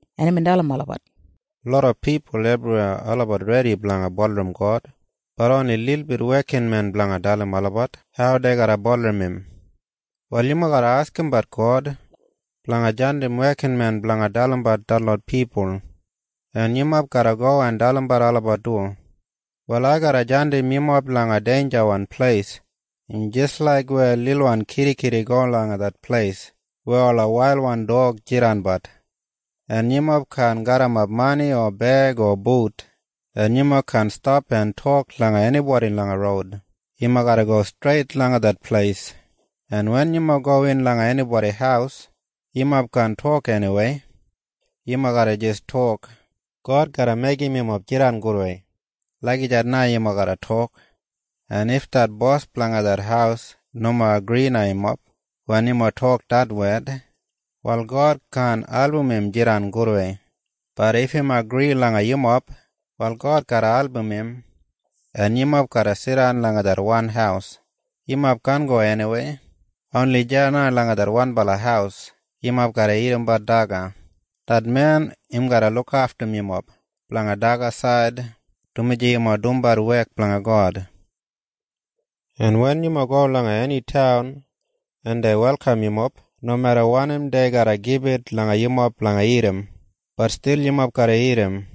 en imbin dalim olabat, “Loda pipul ebriweya olabat redi blanga bulurrum God. Bat oni lilbit wekinmen blanga dalim olabat hau dei garra bulurrum im. “Wal yumob garra askimbat God blanga jandim wekinmen blanga dalimbat detlot pipul. En yumob garra go en dalimbat olabat du. “Wal ai garra jandim yumob langa deinjawan pleis. Im jis laik weya lilwan kidikidi go langa det pleis weya ola wailwan dog jidanbat. En yumob kaan garrimap mani o beig o but, en yumob kaan stap en tok langa enibodi langa roud. Yumob garra go streit langa det pleis, en wen yumob gowin langa enibodi haus, yumob kaan tok eniwei. Yumob garra jis tok, ‘God garra meigim yumob jidan gudwei.’ Lagijat na yumob garra tok. En if det bos blanga det haus nomo agri langa yumob wen yumob tok det wed, wal God kaan album im jidan gudwei. Bat if im agri langa yumob, wal God garra album im, en yumob garra jidan langa det wan haus. Yumob kaan go eniwei. Oni deya na langa det wanbala haus yumob garra dagadagat daga. Det men im garra lukaftum yumob blanga dagasaid dumaji yumob dumbat wek blanga God. “En wen yumob go langa eni taun en dei welkam yumob, nomeda wanim dei garra gibit langa yumob blanga dagat, bat stil yumob garra dagat.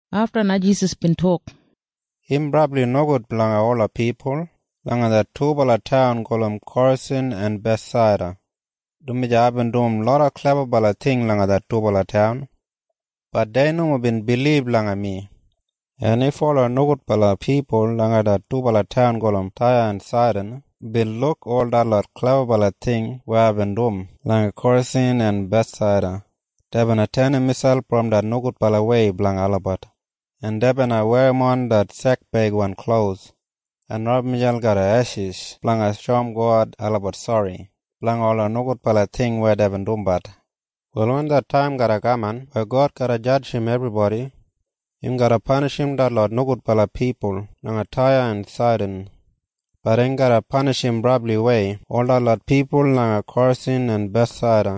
Afta na Jisas bin tok, “Im brabli nogud blanga ola pipul langa det dubala taun gulum Korasin en Bethsaida, dumaji aibin dum loda klebabala ting langa det dubala taun. Bat dei nomo bin bilib langa mi. En if ola nogudbala pipul langa det dubala taun gulum Taya en Saidan bin luk ol detlot klebabala ting weya aibin dum langa Korasin en Bethsaida, dei bina tenim miselp brom det nogudbalawei blanga olabat, en dei bina werrimon det sekbeigwan klos en rabum miselp garram eshis blanga shoum God olabat sori blanga ola nogudbala ting weya deibin dumbat. “Wal wen det taim garra kaman weya God garra jadjim ebribodi, im garra panishim detlot nogudbala pipul langa Taya en Saidan. Bat im garra panishim brabliwei ol detlot pipul langa Korasin en Bethsaida.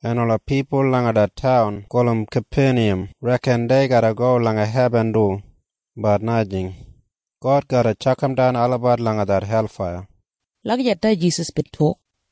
En ola pipul langa det taun gulum Kapeniyam reken dei garra go langa hebin du. Bat najing. God garra tjakamdan olabat langa det helfaiya.” Lagijat na Jisas bin tok.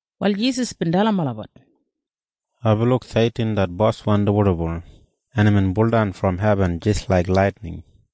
Wal Jisas bin dalim olabat, “Aibin luk Seitin det boswan dibuldibul, en imbin buldan brom hebin jis laik laitining.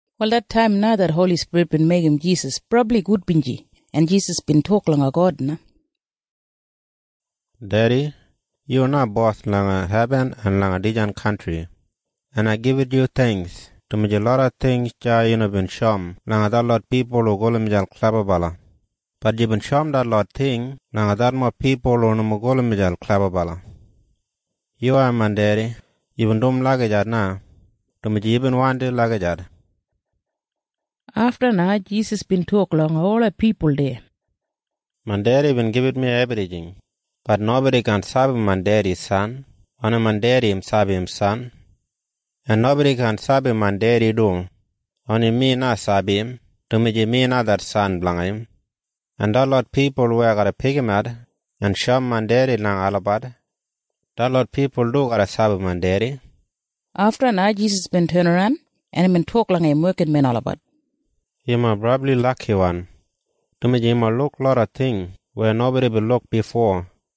Wal det taim na det Holi Spirit bin meigim Jisas brabli gudbinji, en Jisas bin tok langa God na, “Dedi, yu na Bos langa hebin en langa dijan kantri, en ai gibit yu theingks, dumaji loda ting deya yu nomo bin shoum langa detlot pipul hu gulum miselp klebabala. Bat yubin shoum detlot ting langa detlot pipul hu nomo gulum miselp klebabala. Yuwai, main Dedi, yubin dum lagijat na, dumaji yubin wandim lagijat.” Afta na Jisas bin tok langa ola pipul deya, “Main Dedi bin gibit mi ebrijing. Bat nobodi kaan sabi main Dedi san. Oni main Dedi sabi im san. En nobodi kaan sabi main Dedi du. Oni mi na sabi im, dumaji mi na det san blanga im. En detlot pipul weya ai garra pikimat en shoum main Dedi langa olabat, detlot pipul du garra sabi main Dedi.” Afta na Jisas bin tenaran, en imbin tok langa im wekinmen olabat, “Yumob brabli lakiwan, dumaji yumob luk loda ting weya nobodi bin luk bifo.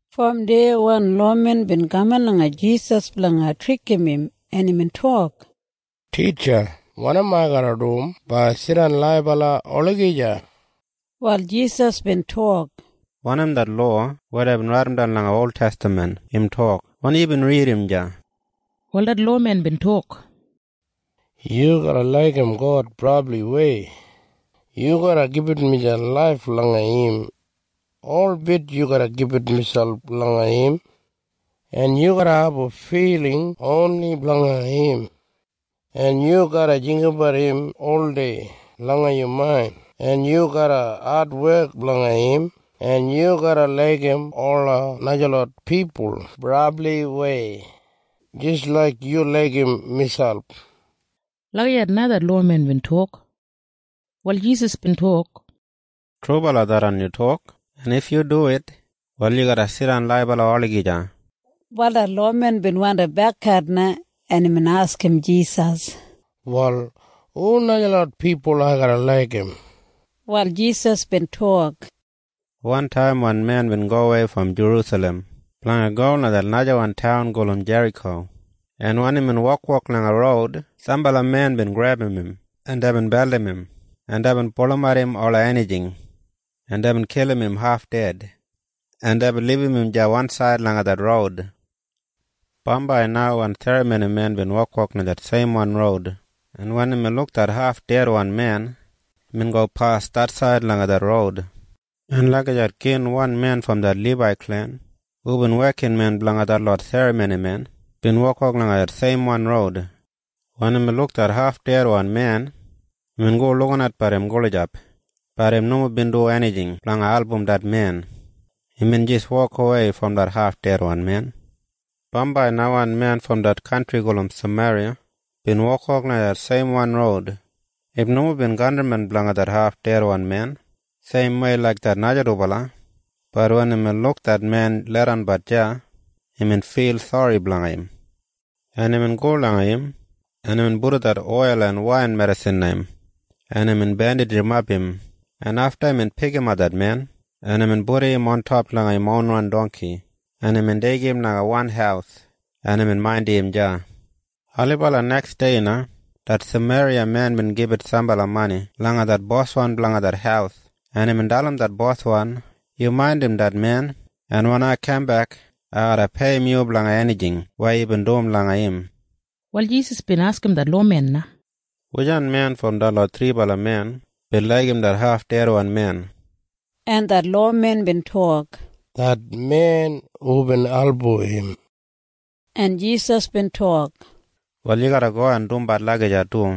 Brom deya wan lowamen bin kaman langa Jisas blanga trikim im, en imbin tok, “Titja, wanim ai garra dum blanga jidan laibala olagija?” Wal Jisas bin tok, “Wanim det lowa weya deibin raidimdan langa oltestaman im tok? Wanim yubin ridim deya?” Wal det lowamen bin tok, “‘Yu garra laigim God brabliwei. Yu garra gibit miselp laif langa im. Holbit yu garra gibit miselp langa im. En yu garra abum filing oni blanga im, en yu garra jinggabat im oldei langa yu main, en yu garra adwek blanga im.’ En ‘Yu garra laigim ola najalot pipul brabliwei jis laik yu laigim miselp.’” Lagijat na det lowamen bin tok. Wal Jisas bin tok, “Trubala tharran yu tok. En if yu duwit, wal yu garra jidan laibala olagija.” Wal det lowamen bin wandi bekat na, en imbin askim Jisas, “Wal hu najalot pipul ai garra laigim?” Wal Jisas bin tok, “Wantaim wan men bin gowei brom Jerusalem blanga go langa det najawan taun gulum Jeriko, en wen imbin wokwok langa roud, sambala men bin grebum im, en deibin beldim im, en deibin pulumat im ola enijing, en deibin kilim im haf ded, en deibin libum im deya wansaid langa det roud. “Bambai na wan serramonimen bin wokwok langa det seimwan roud, en wen imbin luk det hafdedwan men, imbin gopas det said langa det roud. En lagijat gin wan men brom det Libai klen hubin wekinmen blanga detlot serramonimen bin wokwok langa det seimwan roud, en wen imbin luk det hafdedwan men, imbin go en lukinat langa im gulijap. Bat im nomo bin dum enijing blanga album det men. Imbin jis wokawei brom det hafdedwan men. “Bambai na wan men bin brom det kantri gulum Sameriya bin wokwok langa det seimwan roud. Im nomo bin kantrimen blanga det hafdedwan men seimwei laik det naja dubala. Bat wen imbin luk det men leidanbat deya, imbin fil sori blanga im, en imbin go langa im, en imbin pudum det oil en wain medisin langa im, en imbin bendijimap im, en afta imbin pikimap det men, en imbin pudum im ontop langa im ronwan dongki, en imbin deigim im langa wan haus, en imbin maindimbat im deya. “Ailibala neksdei na det Sameriya men bin gibit sambala mani langa det boswan blanga det haus, en imbin dalim det boswan, ‘Yu maindim det men, en wen ai kambek, ai garra peiyim yu blanga enijing weya yubin dum blanga im.’” Wal Jisas bin askim det lowamen na, “Wujan men brom detlot thribala men bin laigim det hafdedwan men?” En det lowamen bin tok, “Det men hubin album im.” En Jisas bin tok, “Wal yu garra go en dumbat lagijat du.”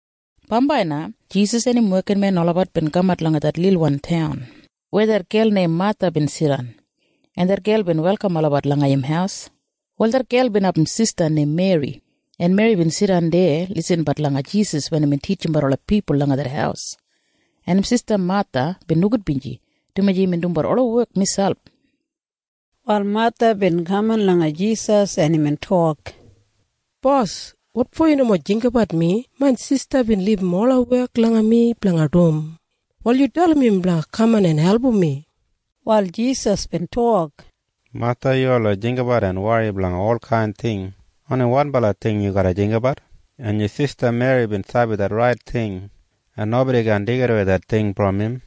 Bambai na Jisas en im wekinmen olabat bin kamat langa det lilwan taun weya det gel neim Matha bin jidan, en det gel bin welkam olabat langa im haus. Wal det gel bin abum sista neim Meri, en Meri bin jidan deya lisinbat langa Jisas wen imbin titjimbat ola pipul langa det haus, en im sista Matha bin nogudbinji, dumaji imbin dumbat ola wek miselp. Wal Matha bin kaman langa Jisas, en imbin tok, “Bos, wotfo yu nomo jinggabat mi? Main sista bin libum ola wek langa mi blanga dum. Wal yu dalim im blanga kaman en album mi.” Wal Jisas bin tok, “Matha, yu oldei jinggabat en wori blanga olkain ting. Oni wanbala ting yu garra jinggabat. En yu sista Meri bin sabi det rait ting, en nobodi kaan deigidawei det ting brom im.”